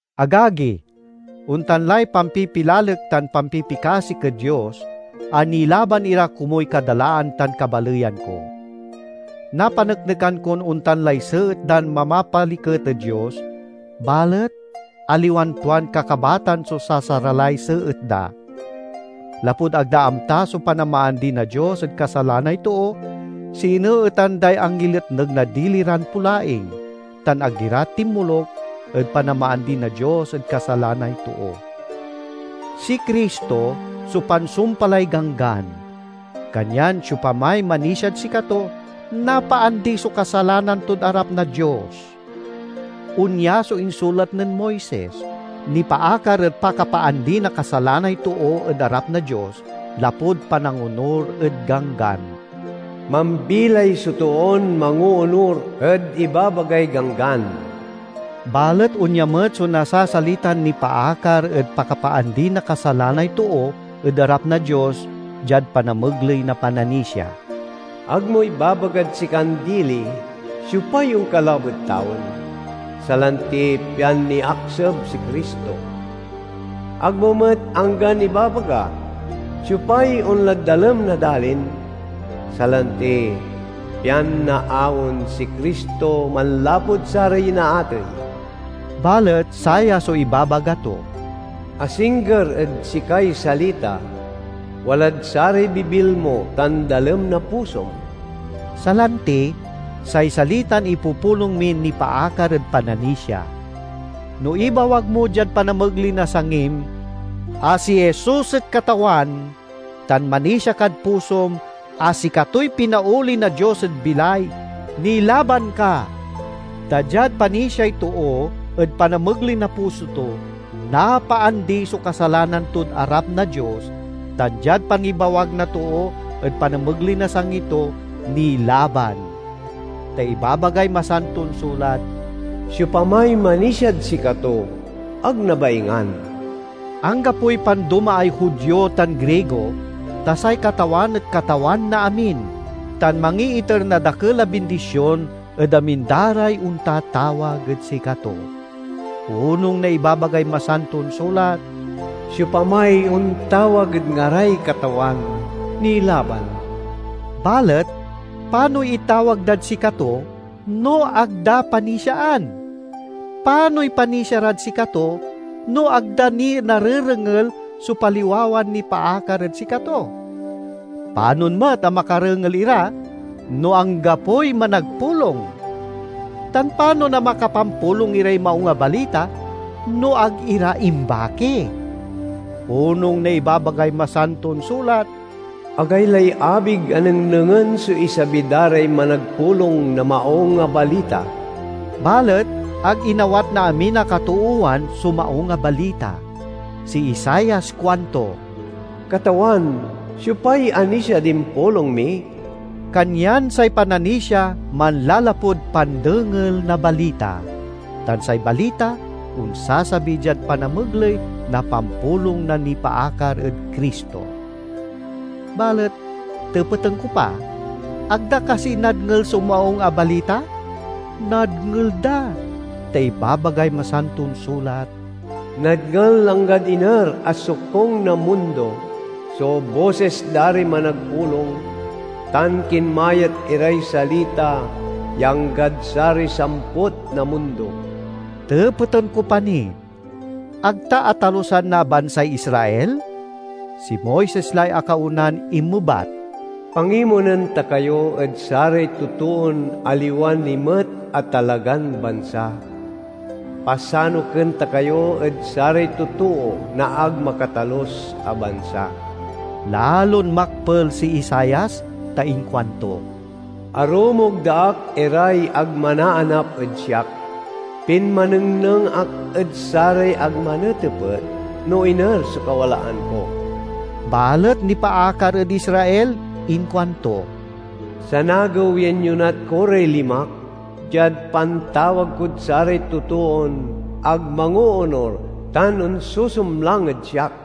Agagi, ontan lay pampipilalek tan pampipikasik ed Dios a nilaban ira komuy kadalaan tan kabaleyan ko. Napaneknekan kon ontan lay seet dan mamapaliket ed Dios, balet aliwan tuan kakabatan so sasaralay seet da. Lapud ag da amta so panamaandi na Dios ed kasalanay too, sineetan day angiletneg na dili ran polaing, tan ag ira tinmoluk ed panamaandi na Dios ed kasalanay too. Si Cristo so pansumpalay Ganggan, kanyan siopamay manisiad sikato, napaandi so kasalanan tod arap na Dios. Onya so insulat nen Moises, nipaakar ed pakapaandi na kasalanay too ed arap na Dios lapud panangonur ed Ganggan: "Mambilay so toon mangoonur ed ibabagay Ganggan." Balet onya met so nasasalitan nipaakar ed pakapaandi na kasalanay too ed arap na Dios diad panamegley na pananisia: "Ag mo ibabagad sikan dili, Siopay onkalab ed tawen?" (salanti, pian niakseb si Cristo). Ag mo met anggan ibabaga, "Siopay onlad dalem na dalin?" (salanti, pian naaon si Cristo manlapud saray inaatey). Balet saya so ibabaga to, "Asingger ed sikay salita, walad saray bibil mo tan dalem na pusom"— salanti, say salitan ipupulong min nipaakar ed pananisia. No ibawag mo diad panamegley na sangim a si Jesus et Katawan tan manisia kad pusom a sikatoy pinaoli na Dios ed bilay, nilaban ka. Ta diad panisiay too ed panamegley na puso to, napaandi so kasalanan tod arap na Dios tan diad pangibawag na too ed panamegley na sangi to, nilaban. Ta ibabagay Masanton Sulat, "Siopamay manisiad sikato, ag nabaingan." Anggapoy pandomaay Judio tan Grigo, ta say Katawan et Katawan na amin, tan mangiiter na dakel a bindision ed amin da ray ontatawag ed sikato. Onung na ibabagay Masanton Sulat, "Siopamay ontawag ed ngaray Katawan, nilaban." Balet panoy itawag dad sikato, no ag da panisiaan? Panoy panisia rad sikato, no ag da ni narerengel so paliwawan nipaakar ed sikato? Panon met a makarengel ira, no anggapoy managpulong? Tan panon a makapampulong iray Maung a Balita, no ag ira imbaki? Onung na ibabagay Masanton Sulat, "Agaylay abig a nengnengen so isabi da ray managpulong na Maung a Balita!" Balet ag inawat na amin a katoowan so Maung a Balita. Si Isaias kuanto, "Katawan, siopay anisiad impulong mi?" Kanyan say pananisia manlalapud pandengel na balita, tan say balita onsasabi diad panamegley na pampulong na nipaakar ed Cristo. Balet tepeten ko pa: Ag da kasi nadngel so Maung a Balita? Nadngel da, ta ibabagay Masanton Sulat: "Nadngel anggad iner a sokung na mundo so bosis da ray managpulong, tan kinmayat iray salita ya anggad saray samput na mundo." Tepeten ko pa ni: Ag ta atalusan na bansay Israel? Si Moises lay akaonan inmebat: "Pangimonen ta kayo ed saray totoon aliwa ni met a talagan bansa; Pasanuken ta kayo ed saray totoo na ag makatalus a bansa." Lalon makpel si Isaias ta inkuanto, "Arumog da ak iray ag manaanap ed siak. Pinmanengneng ak ed saray ag manetepet no iner so kawalaan ko." Balet nipaakar ed Israel, inkuanto, "Sanagew ya inyonat ko ray limak diad pantawag kod saray totoon ag mangoonur tan onsusumlang ed siak."